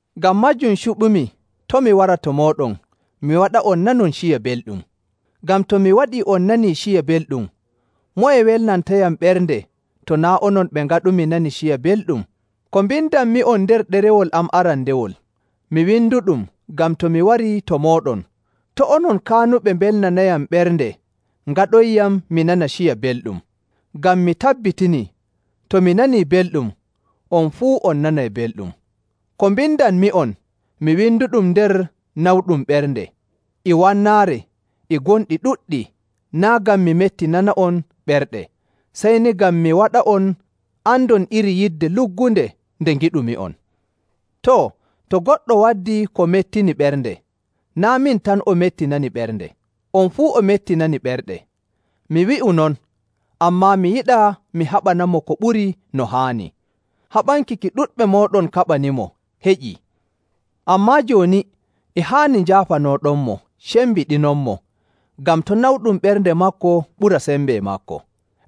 Ngam maajum cuɓumi to' mi wara to mooɗon mi waɗa'on nanon ciya belɗum. Ngam to mi waɗii on nanii ciya belɗum, moye welnantayam ɓernde to naa' onon ɓe ngaɗumi nani ciya belɗum? Ko mbindanmi'on nder ɗerewol am arandewol, mi winduɗum ngam to mi warii to mooɗon to' onon kaanuɓe mbelnanayam ɓernde ngaɗonyam mi nana ciya belɗum. Ngam mi tabbitinii to mi nanii belɗum, on fuu on nanay belɗum. Ko mbindanmi'on, mi winduɗum nder nawɗum ɓernde e wannaare e gonɗi ɗuɗɗi naa' ngam mi mettinana'on ɓerɗe, sey ni ngam mi waɗa'on andon iri yidde luggunde nde ngiɗumi'on. Too, to goɗɗo waddii ko mettini ɓernde, naa' min tan o mettinani ɓernde, on fuu o mettinani ɓerɗe. Mi wi'u non, ammaa mi yiɗaa mi haɓanamo ko ɓuri no haani. Haɓanki ki ɗuɗɓe mooɗon kaɓanimo heƴii. Ammaa jooni e haani njaafanooɗonmo cembiɗinonmo ngam to' nawɗum ɓernde maako ɓura sembe maako.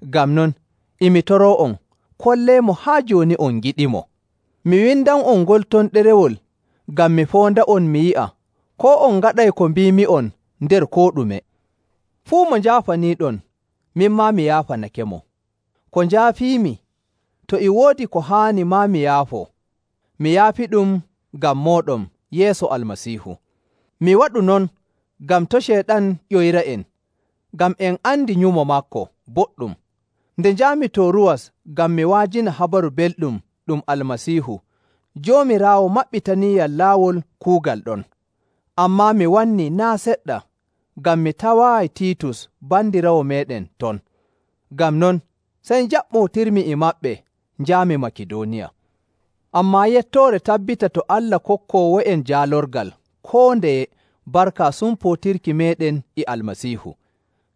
Ngam non, e mi toroo'on, kolleemo haa jooni on ngiɗimo. Mi windan'on ngol ton ɗerewol ngam mi foonda'on mi yi'a koo on ngaɗay ko mbiimi'on nder koo ɗume. Fuu mo njaafaniiɗon, min maa mi yaafanakemo. Ko njaafiimi, to e woodi ko haani maa mi yaafoo, mi yaafiɗum ngam mooɗon yeeso Almasiihu. Mi waɗu non ngam to' Ceyɗan ƴoyra'en, ngam en andi nyumo maako boɗɗum. Nde njaami Tooruwas ngam mi wa'ajina Habaru Belɗum ɗum Almasiihu, Joomiraawo maɓɓitaniiyam laawol kuugal ɗon. Ammaa mi wannii naa' seɗɗa ngam mi tawaayi Tiitus bandiraawo meeɗen ton. Ngam non, sey njaɓɓootirmi e maɓɓe njaami Makidooniya. Ammaa yettoore tabbita to Allah kokkoowo'en jaalorgal koo ndeye barka sumpootirki meeɗen e Almasiihu.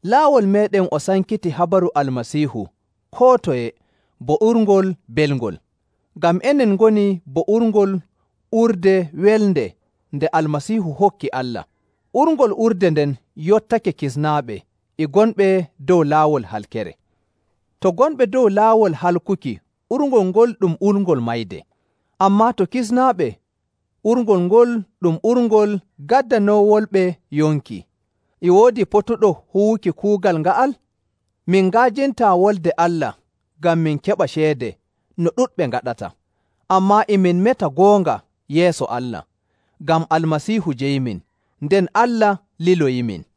Laawol meeɗen o sankitii habaru Almasiihu koo toye bo urngol belngol. Ngam enen ngoni bo urngol urde welnde nde Almasiihu hokki Allah. Urngol urde nden yottake kisnaaɓe e gonɓe dow laawol halkere. To gonɓe dow laawol halkuki urngol ngol ɗum urngol mayde. Ammaa to kisnaaɓe urngol ngol ɗum urngol gaddanoowolɓe yonki. E woodi potuɗo huwuki kuugal nga'al? Min nga'ajintaa Wolde Allah ngam min keɓa ceede no ɗuɗɓe ngaɗata. Ammaa e min meta goonga yeeso Allah, ngam Almasiihu jeyimin, nden Allah liloyimin.